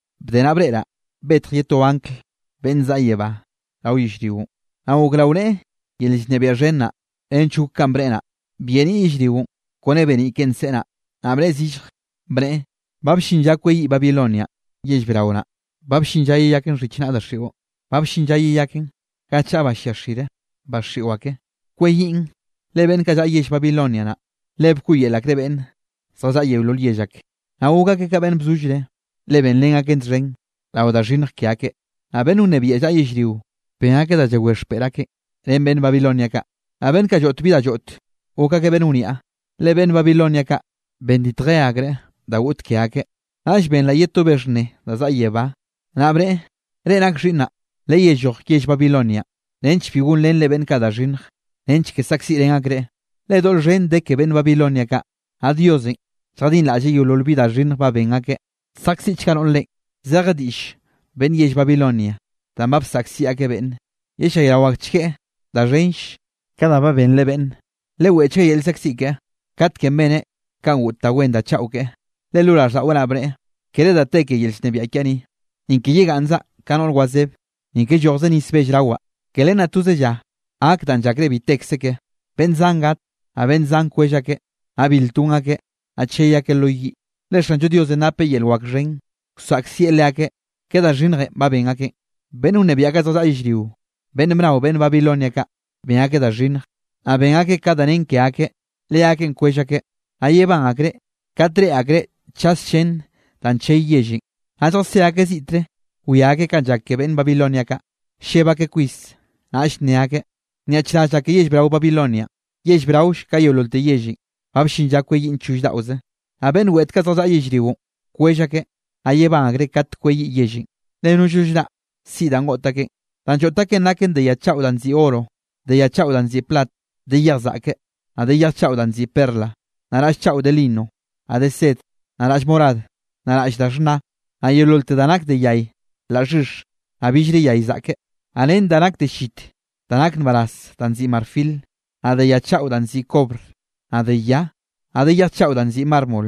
Bde naꞌ breꞌraꞌ betj ye to angl beꞌnn bzaꞌa yebánꞌ rao yellrionꞌ, naꞌ gok rao neꞌe yel llnebiaꞌ xhen naꞌ, nench gok kanꞌ bneꞌe naꞌ, byeniꞌ yellrionꞌ kone beniꞌ keꞌen nseꞌe naꞌ. Naꞌ bnneꞌe zillje, bneꞌe: —Ba bllin lla kweyiꞌ Babilonianꞌ yell brao naꞌ. Ba bllin lla yeyaken xhichnaꞌ daxiꞌo. Ba bllin lla yeyaken ga chaꞌa ba llia xire ba xiꞌo ake. Kweyiꞌn, le beꞌnn kaꞌ llaꞌa yell Babilonia naꞌn, le bkoꞌyel akreꞌ beꞌnn zjallaꞌa yeolol yell ak, naꞌ gok akeꞌ ka beꞌnn bzollreꞌ, le benrén akeꞌ leakeꞌ txhen rao da xhinnj ke akeꞌ. Naꞌ beꞌnn wnebiaꞌ llaꞌa yellrio ben akeꞌ da llawé xpeꞌr akeꞌ ren beꞌnn Babilonia kaꞌ, naꞌ beꞌnn kaꞌ lloꞌt bi da lloꞌt, gok akeꞌ beꞌnn wniaꞌ, le beꞌnn Babilonia kaꞌ benditje akreꞌ da goꞌt ke akeꞌ. Naꞌll benraꞌ ye to be xhnne da zaꞌa yebá, naꞌ bneꞌe: —Reꞌ nak xhiꞌnnaꞌ, lelloj yell Babilonianꞌ nench bi gonrenre beꞌnn kaꞌ da xhinnj, nench ke saꞌkziꞌrén akreꞌ. Le doꞌl xhen de ke beꞌnn Babilonia kaꞌ, naꞌ Diosenꞌ lljadinraꞌlleꞌ yeolol bi da xhinnj ba ben akeꞌ. Saꞌkziꞌ akchga noꞌr reꞌen, zeje diꞌll beꞌnn yell Babilonia, danꞌ ba bsaꞌkziꞌ akeꞌ beꞌnne. Yellayraochgueꞌ da xhenll ka da ba benreꞌ beꞌnne. Leweꞌchgueꞌ yel llzaꞌkziꞌ keꞌe, katkenꞌ beneꞌ kanꞌ goꞌt da wen da chaꞌo keꞌe, le lo raꞌlldaꞌweꞌ naꞌ bneꞌe: “Kere da te ke yel llnebiaꞌ kiaꞌ ni, ni ke yegaꞌnnzaꞌ ka noꞌr wazeb, ni ke llojze nis bell rawaꞌ.” Ke len naꞌ toze lla gak danꞌ llakreꞌ bi tekze keꞌe. Beꞌnn zan gat, naꞌ beꞌnn zan kwell akeꞌ, naꞌ bil ton akeꞌ, naꞌ chey akeꞌ lo yiꞌ, le Xanllo Diosenꞌ napeꞌ yel wak xhen, wsaꞌkzieꞌ leakeꞌ ke da xhinnjenꞌ ba ben akeꞌn. Beꞌnn wnebiaꞌ kaꞌ zjallaꞌa yellrio, beꞌnn bnao beꞌnn Babilonia kaꞌ ben akeꞌ da xhinnj, naꞌ ben akeꞌ ka da nen ke akeꞌ, leakeꞌn kwell akeꞌ, naꞌ yebán akreꞌ kat reꞌe akreꞌ chas llén danꞌ chey yellenꞌ. Naꞌ lljasé akeꞌ ziꞌtre wia akeꞌ kanꞌ llak ke beꞌnn Babilonia kaꞌ, lleb akeꞌ kwis, naꞌll nne akeꞌ: —¡Nyaꞌchraz llak ke yell brao, Babilonianꞌ, yell braoll ka yeololte yellenꞌ! Ba bllin lla kweyiꞌn choll daꞌoze. Naꞌ beꞌnn weꞌt kaꞌ zjallaꞌa yellrionꞌ kwell akeꞌ, naꞌ yebán akreꞌ kat kweyiꞌ yellenꞌ, le nollno llraꞌ siꞌi danꞌ goꞌt akenꞌ. Danꞌ lloꞌt akeꞌn naken de ya chaꞌo nziꞌi oro, de ya chaꞌo danꞌ nziꞌi plat, de yej zaꞌke, naꞌ de yej chaꞌo danꞌ nziꞌi perla, naꞌ raꞌll chaꞌo de lino, naꞌ de sed, naꞌ raꞌll morad, naꞌ raꞌll da xhna, naꞌ yeololte da nak de yay laꞌ xhix, naꞌ billre yay zaꞌke, naꞌ ren da nak de llit da nak nbaraz da nziꞌi marfil, naꞌ de ya chaꞌo danꞌ nziꞌi kobr, naꞌ de ya, naꞌ de yej chaꞌo danꞌ nziꞌi mármol.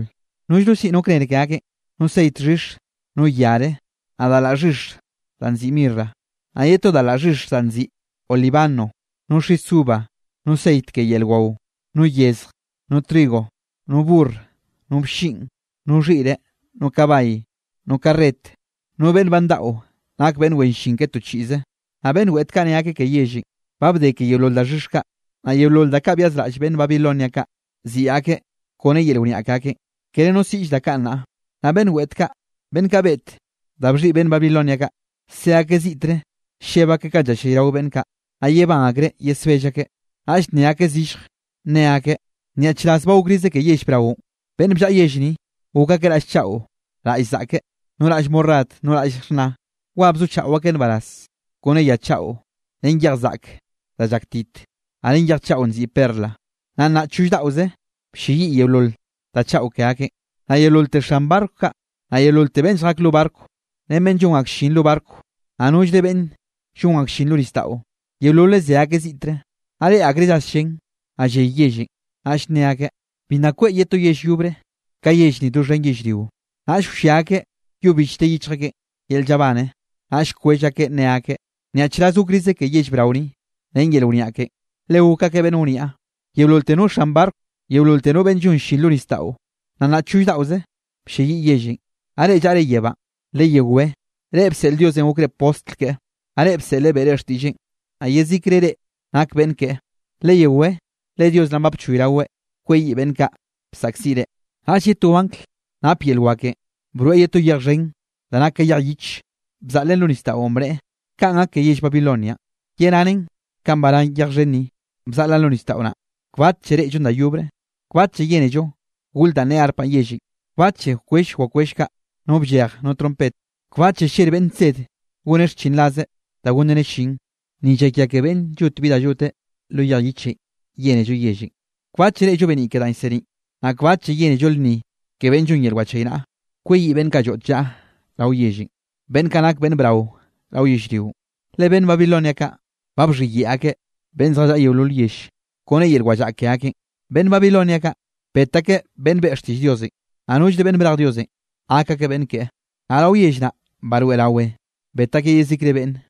Nollno siꞌi no kner ke akeꞌn, no ceit xhix, no yare, naꞌ da laꞌ xhix danꞌ nziꞌi mirra, naꞌ ye to da laꞌ xhix danꞌ nziꞌi olíbano, no xis uva, no ceit ke yel wao, no yezje, no trigo, no burr, no blliꞌn, no xhiꞌre, no kabay, no karret, no beꞌnne ba ndaꞌo nak beꞌnn wen llin ke to chiꞌze. Naꞌ beꞌnn weꞌt kaꞌ nne akeꞌ ke yellenꞌ: —Ba bde ke yeolol daxhix kaꞌ, naꞌ yeolol da kaꞌ byazraꞌll beꞌnn Babilonia kaꞌ siꞌi akeꞌ kone yel wniaꞌ ke akeꞌn, kere no siꞌll da kaꞌ nnaꞌ. Naꞌ beꞌnn weꞌt kaꞌ, beꞌnn kaꞌ beꞌt da bxhiꞌi beꞌnn Babilonia kaꞌ, se akeꞌ ziꞌtre lleb akeꞌ kanꞌ llallayrao beꞌnn kaꞌ, naꞌ yebán akreꞌ yesbell akeꞌ. Naꞌll nne akeꞌ zillje, ne akeꞌ: —¡Nyaꞌchraz ba gokrize ke yell braonꞌ! Beꞌnn bllaꞌa yell ni, gok akeꞌ raꞌll chaꞌo raꞌll zaꞌke, no raꞌll morad, no raꞌll xhna. Wa bzochaꞌo akeꞌ nbaraz kone ya chaꞌo ren yej zaꞌke da llaktit, naꞌ ren yej chaꞌo nziꞌi perla. Naꞌ nnaꞌ choll daꞌoze blleyiꞌ yeolol da chaꞌo ke akeꞌn. Naꞌ yeololte xan barco kaꞌ, naꞌ yeololte beꞌnn lljak lo barco, ren beꞌnn llon ak llin lo barco, naꞌ nollre beꞌnn llon ak llin lo nisdaꞌon, yeololeꞌ se akeꞌ ziꞌtre. Naꞌ reꞌe akreꞌ llas llén, naꞌ lley yellenꞌ, naꞌll nne akeꞌ: —Bi nna kweꞌ ye to yell yobre ka yell ni doxhen yellrio. Naꞌll wllia akeꞌ yo bichte yichj akeꞌ yel llabane, naꞌll kwell akeꞌ nne akeꞌ: —¡Nyaꞌchraz gokrize ke yell brao ni! Ren yel wniaꞌ ken, le gok akeꞌ beꞌnn wniaꞌ, yeololte no xan barco, yeololte no beꞌnn llon llin lo nisdaꞌon, naꞌ nnaꞌ choll daꞌoze blleyiꞌ yellenꞌ. Naꞌ reꞌ llaꞌre yebánꞌ, leyewé, reꞌ bseꞌl Diosenꞌ gokre postl keꞌe, naꞌ reꞌ bseꞌleꞌ beꞌre xtiꞌlleꞌn, naꞌ yezikre reꞌ nak beꞌnn keꞌe, leyewé le Dios naꞌ ba bchoyraweꞌ kweyiꞌ beꞌnn kaꞌ bsaꞌkziꞌ reꞌ. Naꞌll ye to anglenꞌ nap yel wakenꞌ broeꞌ ye to yej xhen da nak ka yej yich, bzaꞌlen lo nisdaꞌon, bneꞌe: —Kanꞌ gak ke yell Babilonianꞌ, yeranen kanꞌ barán yej xhen ni, bzaꞌlaꞌn lo nisdaꞌo naꞌ, kbatlle reꞌllon da yobre. Kbatlle yénello gol danꞌ ne arpa yellenꞌ, kbatlle wkwell wakwell kaꞌ no bllej no trompet. Kbatlle ller beꞌnn nsed goneꞌ xchinrazre da gonreneꞌ llin, ni llakia ke beꞌnn llot bi da lloteꞌ lo yej yich yénello yellenꞌ. Kbatlle reꞌllo beniꞌ ke danꞌ llseniꞌn, naꞌ kbatlle yénello lnni ke beꞌnn llon yel wachaynaꞌa. Kweyiꞌ beꞌnn kaꞌ lloꞌt llaꞌo rao yellenꞌ, beꞌnn kaꞌ nak beꞌnn brao rao yellrionꞌ, le beꞌnn Babilonia kaꞌ ba bxhiyeꞌe akeꞌ beꞌnn zjallaꞌa yeolol yell kone yel wallaꞌa ke akeꞌn. Beꞌnn Babilonia kaꞌ, bet akeꞌ beꞌnn beꞌe xtiꞌll Diosenꞌ, naꞌ nollre beꞌnn brej Diosenꞌ gak akeꞌ beꞌnn keꞌe. Naꞌ rao yell naꞌ baroeꞌrawe bet akeꞌ yezikre beꞌnne.